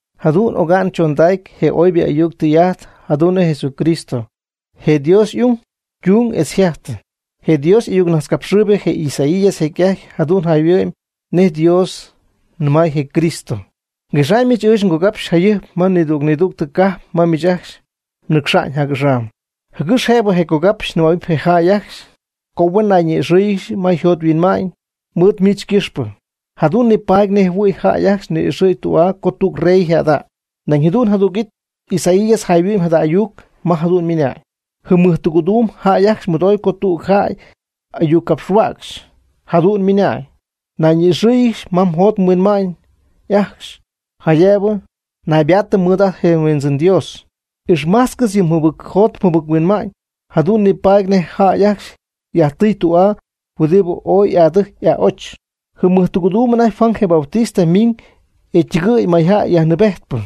Jadu'n oga'ñ chondacy je oybɨ ayuc tɨy'ajt jadu'n nej Jesucristo, je Dios y'ung ytun etz yjajtɨ. Je Dios y'ayucnajtzcapxɨɨybɨ je Isaías jecy'ajty jayhuɨ'my jadu'n nej Dios nɨmay je Cristo: Nguexaamyɨch ɨɨch ngogapxy jayɨjp ma nidüg nidüg cajp ma miich mnɨcxa'ñ jac'axam, jɨgɨx jëb je cogapxy nɨmähuɨpy je jäy ajcxy co huen nayñi'ixɨ́ɨyɨgɨxy ma yjot yhuinma'ñ mɨɨd miich ycɨxpɨ, jadu'n nipaady nej jɨhuɨ̈y jäy ajcxy ni'ixɨ̈y tü'aa co tüg rey yjäda'ñ. Nañ jadu'n jadüg it Isaías jayhuɨ'my jada ayuc ma jadu'n ymɨnañ: Jɨm mɨjtɨgɨ̈duum jäy ajcxy mɨdoy co tüg jäy y'ayuccapxhuäcxy, jadu'n ymɨnañ: “Nayñi'ixɨɨyɨgɨx ma mjot mhuinma'ñ ajcxy jaydëb naybaatɨm mɨɨd ajt nHuindzɨn Dios. Ixmájtzcɨxy yɨ mjɨbɨcjot mjɨbic-huinma'ñ. Jadu'n nipaady nej jäy ajcxy yajtɨy tü'aa huɨdibɨ ooy y'adɨjy y'a'och.” Jɨm mɨjtɨgɨ̈duum anajty Juan je Bautista miñ e ytɨgɨɨy mayjäy yajnɨɨbejtpɨ.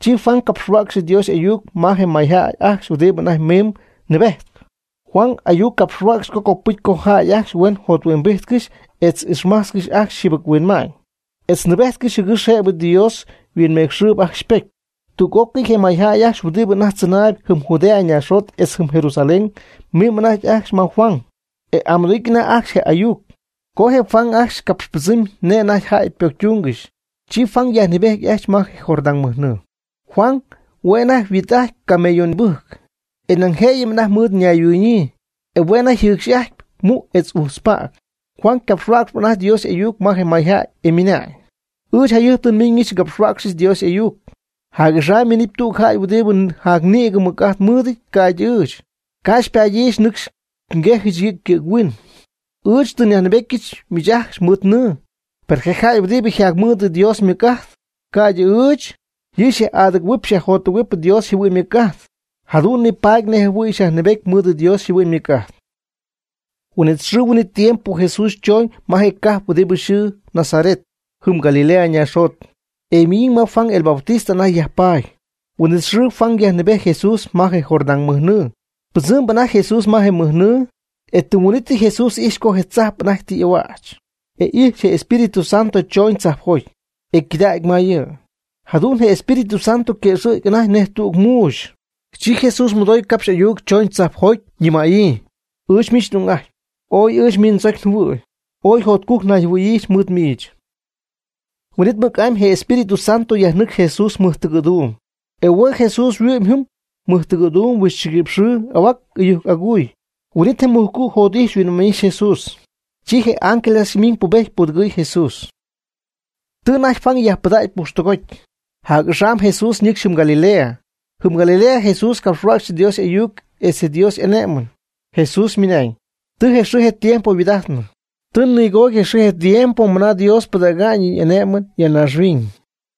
Chi Juan capxhuäcxy Dios y'ayuc ma je mayjäy ajcxy huɨdibɨ anajty mimb nɨɨbejtp. Juan ayuc capxhuäcx co copɨcy co jäy ajcxy huen jothuimbíjtcɨxy etz ixmájtzcɨxy ajcxy je yjɨbɨchuinma'ñ, etz nɨɨbéjtcɨxy, jɨgɨx jëbɨ Dios yhuinmecxɨɨb ajcxy ypocy. Tüg'ócɨy je mayjäy ajcxy huɨdibɨ anajty tzɨnaayb jɨm Judea ñaaxjot etz jɨm Jerusalén mimb anajty ajcxy ma Juan, e y'amɨdoo'ijty anajty ajcxy je'y'ayuc. Co je jäy ajcxy capxpɨdzɨɨmy nej anajty ypocytúngɨxy, chi Juan yajnɨɨbejty ajcxy ma je Jordán mɨjnɨɨ. Juan hue' anajty yhuit'ajtpy camello nïbɨjc, e nañ jëyɨm anajty mɨɨd ñayhuɨɨñyii, e hue' anajty yjɨcx'ajtpy mu' etz uxpäg. Juan ycapxhuäcxyp anajty Dios y'ayuc ma je mayjäy, e ymɨnañ: ―Ɨɨch jayɨjp tɨ nmiñɨch ngapxhuäcxy Dios y'ayuc. Jac'axam minɨpy tüg jäy huɨdibɨ jacnïgɨ mɨc'ajt mɨɨdɨty ca'ydɨ ɨɨch, ca' xypaadyɨch nɨcxy nguejyɨch yɨ' ycɨ̈ghuin. Ɨɨch tɨ nyajnɨɨbetyɨch miich ajcxy mɨɨd nɨɨ. Per je jäy huɨdibɨ yjacmɨɨd Dios ymɨc'ajt, ca'ydɨ ɨɨch. Yɨ' xyaj'adɨgɨ̈huɨp xyajjotɨgɨ̈huɨp Dios yjɨhuɨ'ñ ymɨc'ajt, jadu'n nipaadɨp nej jɨhuɨ̈y xyajnɨɨbedɨp mɨɨd Dios yjɨhuɨ'ñ ymɨc'ajt. Je huin'it xɨɨ huin'it tiempo Jesús chooñ ma je cajp huɨdibɨ yxɨɨ Nazaret, jɨm Galilea ñaaxjot, e ymiñ ma Juan el Bautista anajty yajpaady. Huin'it xɨɨ Juan yajnɨɨbejty Jesús ma je Jordán mɨjnɨɨ. Pɨdzɨmb anajty Jesús ma je mɨjnɨɨ, e tɨm huin'ítyɨ Jesús ijx co je tzajp anajty y'ahuäch, e ijx je Espíritu Santo chooñ tzajpjoty, e ycɨdägy ma yɨ'. Jadu'n je Espíritu Santo yquëxɨ̈gy anajty nej tüg muuxy. Chi Jesús mɨdooy capxy ayuc choñ tzajpjoty, nɨmäyii: ―Ɨɨch miich n'ung'ajtpy. Ooy ɨɨch miich ndzocy njɨhuɨ̈y. Ooy jotcujc nayjɨhuɨ̈yiijɨch mɨɨd miich. Huin'it mɨc'amy je Espíritu Santo yajnɨcxy Jesús mɨjtɨgɨ̈duum. E hue' Jesús yhuɨ'mɨy jɨm mɨjtɨgɨ̈duum huixchɨguïpx xɨɨ ahua'n ɨyujc agujc. Huin'it je mujcu' jot'ijxy yhuinma'ñ'ijxy je Jesús. Chi je ángeles ajcxy miñ ypubejty ypudɨgɨɨy je Jesús. Tɨ anajty Juan yajpɨdägy pujxtɨgoty, jac'axam Jesús ñɨcxy jɨm Galilea. Jɨm Galilea Jesús capxhuäcxy Dios y'ayuc etz yɨ Dios y'ané'mɨn. Jesús ymɨnañ: ―Tɨ je xɨɨ je tiempo yhuaad'ajtnɨ. Tɨ nigoody je xɨɨ je tiempo mɨna Dios pɨdäga'ñ yɨ' y'ané'mɨn ya naaxhuiñ.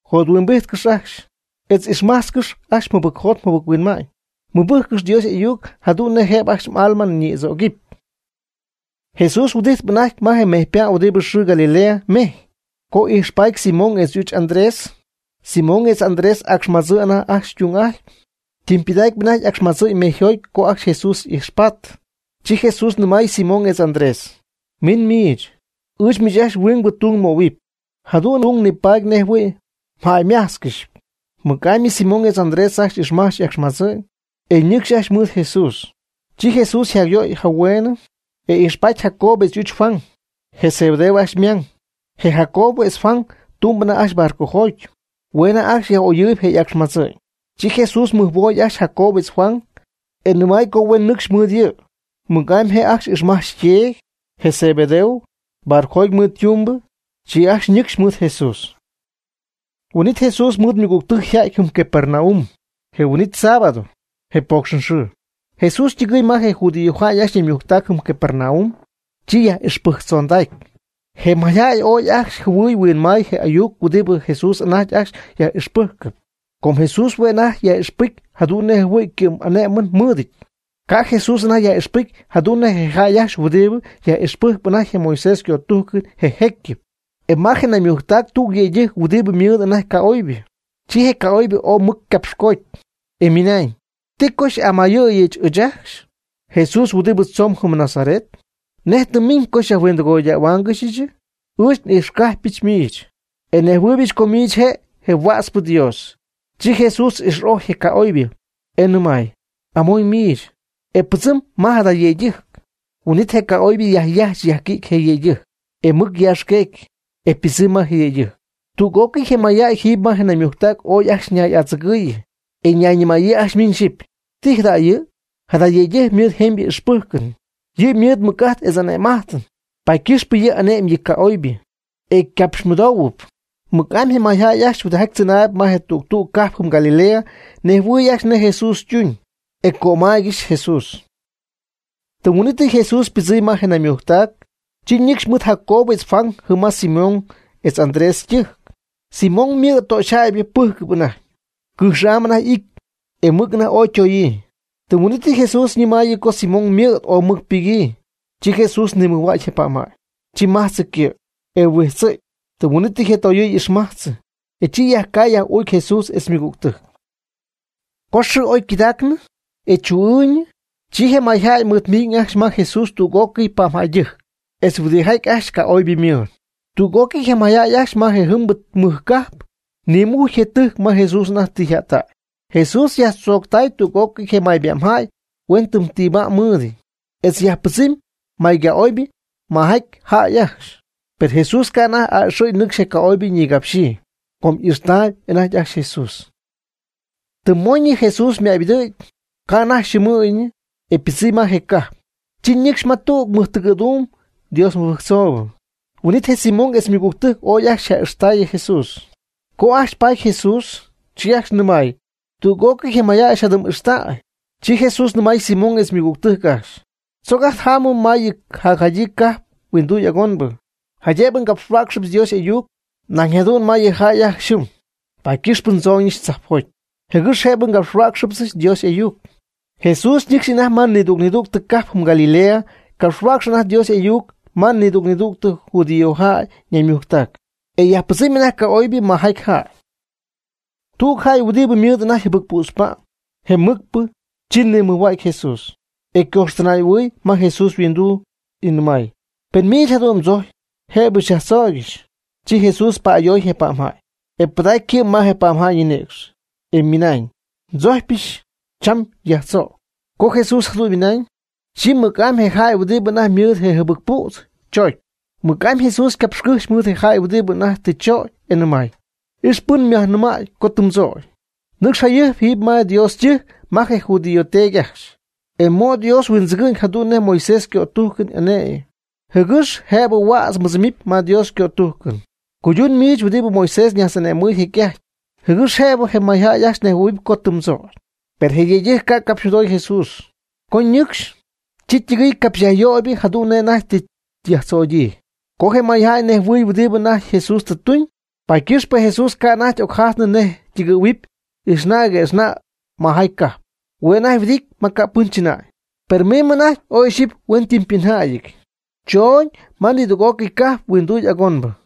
Jothuimbijtcɨx ajcxy, etz ixmajtzcɨx ajcxy mjɨbɨcjot mjɨbɨc-huinma'ñ. Mɨbɨjccɨx Dios y'ayuc jadu'n nej jëb ajcxy m'alma ñïdzögɨpy. Jesús huɨdijtp anajty ma je mejypa' huɨdib yxɨɨ Galilea mejy, co oy'ijxpaady Simón etz y'uch Andrés. Simón etz Andrés acxmadzɨɨ anajty ytung'ajtpy, ytɨmpɨdacpy anajty y'acxmadzɨ'ñ mejyjoty co ajcxy Jesús ijxpaty. Chi Jesús nɨmay Simón etz Andrés: ―Min mɨɨd ɨɨch. Ɨɨch miich ajcxy huingbɨ tung nmöhuɨpy. Jadu'n mdung nipaadɨp nej jɨhuɨ̈y mjäymájtzcɨxɨpy. Mɨc'amy Simón etz Andrés ajcxy ixmajch y'acxmadzɨ'ñ, e ñɨcxy ajcxy mɨɨd Jesús. Chi Jesús yjacyöy anajty hueen, e ijxpaty Jacobo etz y'uch Juan, je Zebedeo ajcxy ymang. Je Jacobo etz Juan tumb anajty barcojoty. Hue' anajty ajcxy yaj'oyɨɨyb je' y'acxmadzɨ'ñ. Chi Jesús mɨjhuooy ajcxy Jacobo etz Juan, e nɨmay co huen nɨcxy mɨɨd yɨ'. Mɨc'amy je' ajcxy ixmajch yteedy, je Zebedeo, barcojoty mɨɨd ytumbɨ, chi ajcxy ñɨcxy mɨɨd Jesús. Huin'it Jesús mɨɨd ymɨgügtɨjc yja'ty jɨm Capernaum. Je huin'it sábado, je poocxɨn xɨɨ, Jesús ytɨgɨɨy ma je judíojäy ajcxy ñaymujctac jɨm Capernaum, chi yjäyyaj'ixpɨjctzondacy. Je mayjäy ooy ajcxy jɨhuɨy huinmay je ayuc huɨdibɨ Jesús anajty ajcxy yaj'ixpɨ́jcɨp. Com Jesús hue' anajty yaj'ixpɨcy jadu'n nej jɨhuɨ̈y ycɨ'm'ané'mɨn mɨɨdɨty. Ca' Jesús anajty yaj'ixpɨcy jadu'n nej je jäy ajcxy huɨdibɨ yaj'ixpɨjcp anajty Moisés ycötújcɨn je jécyɨp. E ma je naymujctac tüg yëydɨjc huɨdibɨ mɨɨd anajty ca'oybɨ. Chi je ca'oybɨ ooy mɨc ycapxcoody, e ymɨnañ: ―¿Ti co xy'amayɨ̈y ɨɨch ajcxy, Jesús huɨdibɨ tzomb jɨm Nazaret? ¿Nej tɨ mmiñ co xyajhuindɨgoyáangɨxyɨchɨ? Ɨɨch n'ijxcajpy miich, e nejhuɨɨybɨch co miich je' je Huätzpɨ Dios. Chi Jesús ix'ojy je ca'oybɨ, e nɨmay: ―Amon miich, e pɨdzɨmb ma jada yëydɨjc. Huin'it je ca'oybɨ yajyajch yajquïdy je yëydɨjc, e mɨc yaaxqueegy, e ypɨdzɨmy ma je yëydɨjc. Tüg'ócɨy je mayjäy jiiby ma je naymujctac ooy ajcxy ñay'adzɨgɨɨyɨ, e ñayñɨmaayɨ ajcxy miñ xyɨpy: ―¿Ti jada' yɨ'? Jada yëydɨjc ymɨɨd jemybɨ ixpɨ́jcɨn. Yɨ' mɨɨd mɨc'ajt etz ane'm'ajt, paady ycɨxpɨ yɨ' ane'my yɨ ca'oybɨ, e ycapxmɨdoohuɨp. Mɨc'amy je mayjäy ajcxy huɨdijaty tzɨnaayb ma tüg tüg cajp jɨm Galilea nejhuɨy ajcxy nej Jesús ytuñ, e cömaaygɨxy Jesús. Tɨm huin'ítɨy Jesús ypɨdzɨmy ma je naymujctac, chi ñɨcxy mɨɨd Jacobo etz Juan jɨm ma Simón etz Andrés ytɨjc. Simón ymɨ̈d töxyjäybɨ pɨ́jcɨp anajty. Cɨjx'am anajty y'ity, e mɨc anajty ooy ytoyii. Tɨm huin'ítɨyɨ Jesús ñɨmaayɨ co Simón ymɨ̈d ooy mɨc ypɨgyii. Chi Jesús nimɨjhuägy je pa'mjäy. Chi majtzɨ ycɨ', e huijtzɨ̈gy. Tɨm huin'ítɨy yɨ toyɨɨ y'ixmajtzɨ, e chi yajcay yaj'uucy Jesús etz ymɨgügtɨjc. Co xɨɨ oy ycɨdacnɨ, e chuu'ɨɨyñɨ, chi je mayjäy mɨɨd miñ ajcxy ma Jesús tüg'ócɨy pa'mjäydɨjc, etz huɨdijaty ajcxy ca'oybɨ ymɨɨd. Tüg'ócɨy je mayjäy ajcxy ma je jɨmbɨ mɨj cajp nimujcy je tɨjc ma Jesús anajty tɨ yjättägy. Jesús yajtzooctay tüg'ócɨy je may pa'mjäy huenytɨmytiibá'mɨty, etz yajpɨdzɨmy may ca'oybɨ majaty jäy ajcxy. Per Jesús ca' anajty a'ɨxɨ̈y nɨcxy je ca'oybɨ ñigapxyii, com y'ixy'ajttaayb anajty ajcxy Jesús. Tɨm mooñɨ Jesús ymaybɨdɨ̈gy, ca' anajty yxɨɨmɨɨyñɨ, e ypɨdzɨmy ma je cajp. Chi ñɨcxy ma tüg mɨjtɨgɨ̈duum Dios mɨbɨjctzoobɨ. Huin'it je Simón etz je ymɨgügtɨjc ooy ajcxy ja'ijxtäy Jesús. Co ajcxy paty je Jesús, chi ajcxy nɨmay: ―Tüg'ócɨy je mayjäy xyjadɨm'ixtäy. Chi Jesús nɨmay Simón etz je ymɨgügtɨjc ajcxy: ―Tzoc ajt jámɨm ma yɨ jacjadyii cajp huinduy agonbɨ, jaydëb ngapxhuäcxɨbɨch Dios y'ayuc nañ jadu'n ma yɨ jäy ajcxy jɨm. Paady ycɨxpɨ ndzooñɨch tzajpjoty, jɨgɨx jëbɨ ngapxhuäcxɨbɨch Dios y'ayuc. Jesús nɨcxp anajty ma nidüg nidüg cajp jɨm Galilea ycapxhuäcx anajty Dios y'ayuc ma nidüg nidüg judíojäy ñaymujctac, e yajpɨdzɨmy anajty ca'oybɨ majaty jäy. Tüg jäy huɨdibɨ ymɨɨd anajty jɨbɨc pützpa'm, je mɨcpɨ, chi nimɨjhuägy Jesús, e ycojxtɨnay'ahuɨɨy ma Jesús yhuinduu, ymɨnañ: ―Pen miich jadu'n tzojcpy, jëb xyajtzögɨch. Chi Jesús pa'ayoy je pa'mjäy, e pɨdacy ycɨ' ma je pa'mjäy ñinïcx, e ymɨnañ: ―Ndzojcpyɨch, cham nyajtzögy. Co Jesús jadu'n ymɨnañ, chi mɨc'amy je jäy huɨdibɨ anajty mɨɨd je jɨbɨc püdz chögy. Mɨc'amy Jesús ycapxcɨ́jxy mɨɨd je jäy huɨdibɨ anajty tɨ chögy, e nɨmay: ―Ix pɨn myajnɨmäy co tɨ mdzögy. Nɨcx jayɨjp jiiby ma Dios ytɨjc ma je judío teedy ajcxy, e mo' Dios yhuindzɨgɨ'ñ jadu'n nej Moisés ycötújcɨn ane'my, jɨgɨx jëbɨ huädz mbɨdzɨmɨpy ma Dios ycötújcɨn. Cuydun miich huɨdibɨ Moisés ñajtz'ane'mɨɨy jecy'ajty, jɨgɨx jëbɨ je mayjäy ajcxy nejhuɨ̈huɨp co tɨ mdzögy. Per je yëydɨjc ca' capxymɨdoy Jesús. Co ñɨcxy, chi ytɨgɨɨy capxy yajyöybɨ jadu'n nej anajty tɨ yajtzögyii. Com je mayjäy nejhuɨɨyb huɨdibɨ anajty Jesús tɨ tuñ, paady ycɨxpɨ Jesús ca' anajty ocjajtnɨ nej ytɨgɨ̈huɨpy ijxna' jɨgue'xna' majaty cajp. Hue' anajty huɨdity ma ca' pɨn chɨnäy. Per miñ anajty y'oy'ixyii huenytɨmypɨnjäyɨty, chooñ ma nidüg'ócɨy cajp huinduy agonbɨ.